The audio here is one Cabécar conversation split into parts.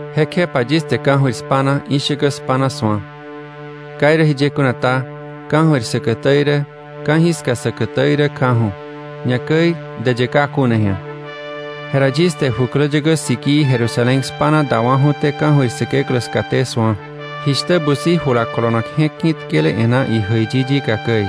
Jekjepa yis te ka̱jöir spa̱na, ishäkä spa̱na su̱a. Ka irä jiye kuna ta, ka̱jöir säkätä irä, ka̱jiska säkätä irä kjaju̱, ñakäi däyë ka kuna ji̱a. Jera yis te jukläyäkä sikii Jerusalén spa̱na dawa̱ju̱té ka̱jöir Säkeklä skaté su̱a, jishtä busi jula kolonak je̱k ki̱tkele e̱ná ijäiyi yika käi.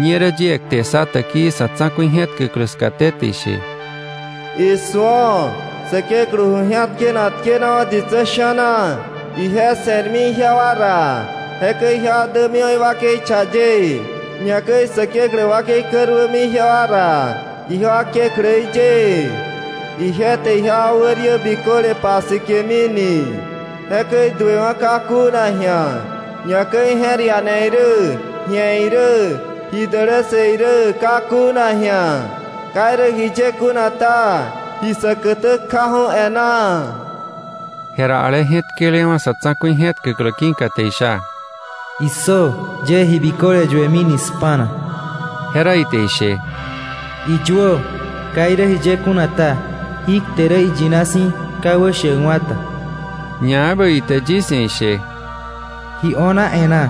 Ñerä yie kte ssa täkii sa̱ tsa̱ku̱i je̱tkäklä skaté, te ishe: “¡Isu̱o! Säkeklä ju ji̱atkenak tkenawa̱ ditsä sha̱na. Ije se̱rmi ijewa ra. Jekäi ijewa dämiwa̱ iwakei cha ye, ñakäi Säkeklä wakei käruämi ijewa ra, ijewa Kekläí ye. Ije te ijewa wä riä biköle pasike̱mini. Jekäi duewa̱ ka kuna ji̱a, ñakäi je̱r iane irä, ji̱e irä, ji dälässë irä ka kuna ji̱a. Ka irä jiye kuna ta, ji säkätä kjaju̱ e̱ná.” Jera ale je̱tkelewa̱ sa̱ tsa̱ku̱i je̱tkäklä ki̱ka te isha: “¡Issö! Yie ji biköle yuemi spa̱na.” Jera ite ishe: “Iyuö. Ka irä jiye kuna ta, jí kte rä iyina si̱, ka wäshäkwa̱ ta.” Ñaebä ite yis ia̱ ishe: “Ji o̱na e̱ná.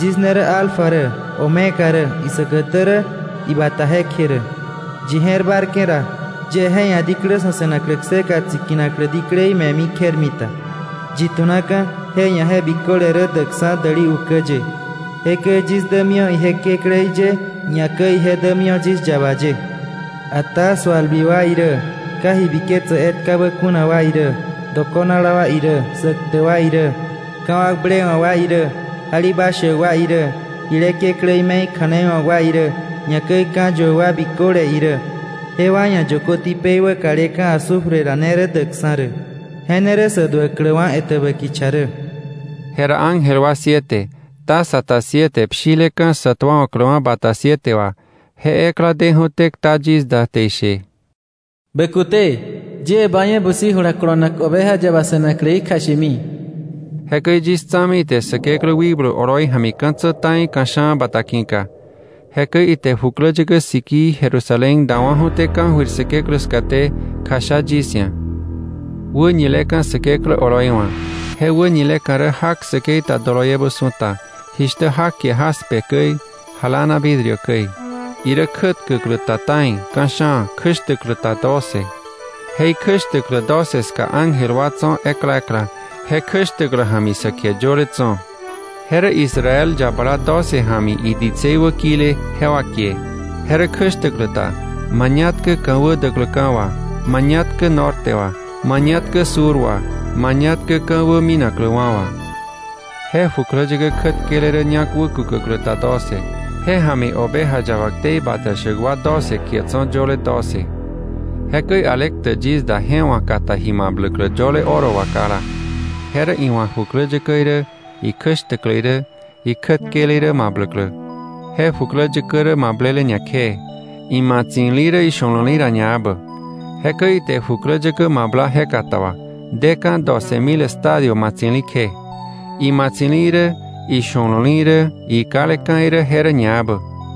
Yis ne rä ‘Alfa’ rä, ‘Omega’ rä, isäkätä rä, ibata jekje rä. Yi je̱r bárke̱ ra, yie je ia̱ diklä sa̱ se̱naklä kseka tsikinaklä diklei me̱mi kjermita. Yi tu̱naka̱ je ia̱ je biköle rä däkksa̱ däli ukä ye. Jekäi yis dämiwa̱ ije Kekläí ye, ñakäi ije dämiwa̱ yis yaba ye. Ata sualbi wa irä, ka ji biketsäk etkabä kuna wa irä, dokonala wa irä, sä ktäk wa irä, ka̱wakblewa̱k wa irä, jalibashäk wa irä, jile kekläí me̱i kja̱nei wa̱k wa irä, ñakäi ka̱yuäk wa biköle irä, jewa ia̱ yökö tipei wäkaleka̱ azufre ra ne rä däkksa̱ rä. Je ne rä sä duäkläwa̱ etäbä kicha rä.” Jera ángel wa siete, taza ta siete pshileka̱ sa tuawa̱kläwa̱ bata siete wà, je ekla deju̱té kta yis da te ishe: “Bä kute, yie ba ia̱ busi jula kolonak, Oveja Yaba se̱nakläí kjashemi.” Jekäi yis tsa̱mi ite Säkeklä wikblu oloi ja̱mi ka̱tsä ta̱i ka̱sha̱a̱ bata ki̱ka. Jekäi ite jukläyäkä sikii Jerusalén dawa̱ju̱té ka̱jöir Säkeklä skaté kjasha yis ia̱, wäñileka̱ Säkeklä oloi wa̱. Je wäñileka̱ rä jak säkei ta doloiebä su̱ta, jishtä jak kie jaspe käi, jalána vidrio käi. Irä kjätkäklä ta ta̱i, ka̱sha̱a̱, kjäshtäklä ta doce. Je ikjäshtäklä doce ska ángel wa tso̱ ekla ekla, je kjäshtäklä ja̱mi sä kie yöle tso̱. Je rä Israel yabala doce ja̱mi iditsei wä kile, jewa kie Je rä kjäshtäklä ta mañatkä ka̱wä däkläka̱ wà, mañatkä norte wà, mañatkä sur wà, mañatkä ka̱wä minakläwa̱ wà. Je jukläyäkä kjätkele rä ñak wäkukäklä ta doce, je ja̱mi Oveja Yaba ktei bata shäk wa doce kie tso̱ yöle doce. Jekäi ale ktäk yis da je wa̱ kata ji mabläklä yöle oro wà kala, je rä iwa̱ jukläyäkä irä, ikjäshtäklä irä, ikjätkele irä mabläklä. Je jukläyäkä rä mablele ñakjee, imatsi̱li rä isho̱lo̱li ra ñaebä. Jekäi ite jukläyäkä mabla je kata wà, deka̱ doce mil estadio matsi̱li kje; imatsi̱li irä, isho̱lo̱li irä, ikaleka̱ irä je rä ñaebä.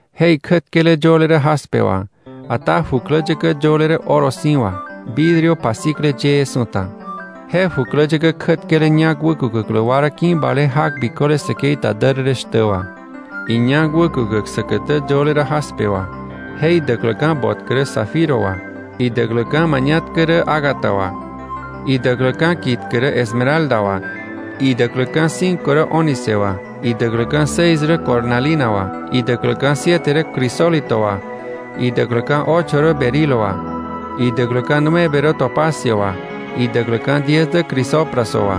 Je ikjätkele yöle rä jaspe wà, ata jukläyäkä yöle rä oro si̱ wà, vidrio pasikle yëë su̱ta. Je jukläyäkä kjätkele ñak wäkukäklä wa rä ki̱bale jak biköle säkei ta därërë shtä wà; iñak wäkukäk säkätä yöle rä jaspe wà, je idäkläka̱ botkä rä zafiro wà, idäkläka̱ mañatkä rä ágata wà, idäkläka̱ kitkä rä esmeralda wà, idäkläka̱ cinco rä ónice wà, idäkläka̱ seis rä cornalina wà, idäkläka̱ siete rä crisólito wà, idäkläka̱ ocho rä berilo wà, idäkläka̱ nueve rä topacio wà, idäkläka̱ diez dä crisopraso wà,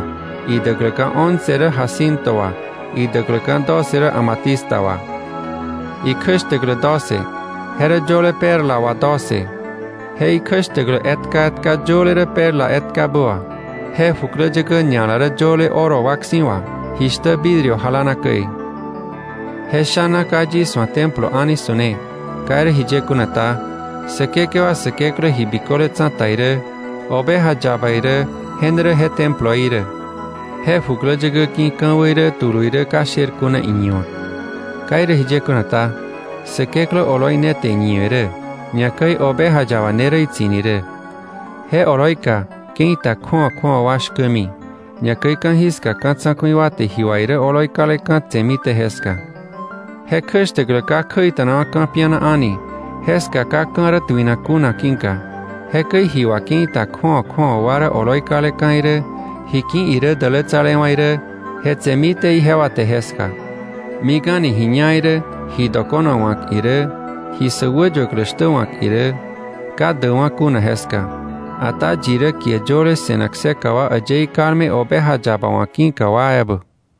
idäkläka̱ once rä jacinto wà, idäkläka̱ doce rä amatista wà. Ikjäshtäklä doce, je rä yöle perla wà doce; je ikjäshtäklä etka etka yöle rä perla etkabä wà. Je jukläyäkä ña̱la rä yöle oro wak si̱ wà, jishtä vidrio jalána käi. Je sha̱na ka yis wa̱ templo a̱ni su̱ne. Ka irä jiye kuna ta, Säkekewa Säkeklä Ji Biköle Tsa̱ta irä, Oveja Yaba irä je ne rä je temploí rä. Je jukläyäkä ki̱ ka̱wä irä tulu irä ka sher kuna iñiwa̱k. Ka irä jiye kuna ta, Säkeklä oloi ne te iñiwe̱ rä, ñakäi Oveja Yaba ne rä itsi̱ni rä. Je oloika ke̱i ta kju̱awa kju̱awa wa shkämi, ñakäi ka̱jiska ka̱ tsa̱ku̱i wa te ji wà irä oloi kaleka̱ tse̱mité jeska. Je kjäshtäklä ka kjäita̱nakwa̱ ka̱piana a̱ni, jeska ka ka̱ rä tuinak kuna ki̱ka. Jekäi ji wà ke̱i ta kju̱awa kju̱awa wa rä oloi kaleka̱ irä, ji ki̱ irä dälätsalewa̱ irä je tse̱mité ijewa te jeska. Mik a̱ni ji ñá irä, ji dokona wa̱k irä, ji sä wäyuäklä shtä wa̱k irä, ka däkwa̱ kuna jeska, ata yi rä kie yöle se̱nak kseka wa äyëí kalme Oveja Yaba wa̱ ki̱ka wa ebä.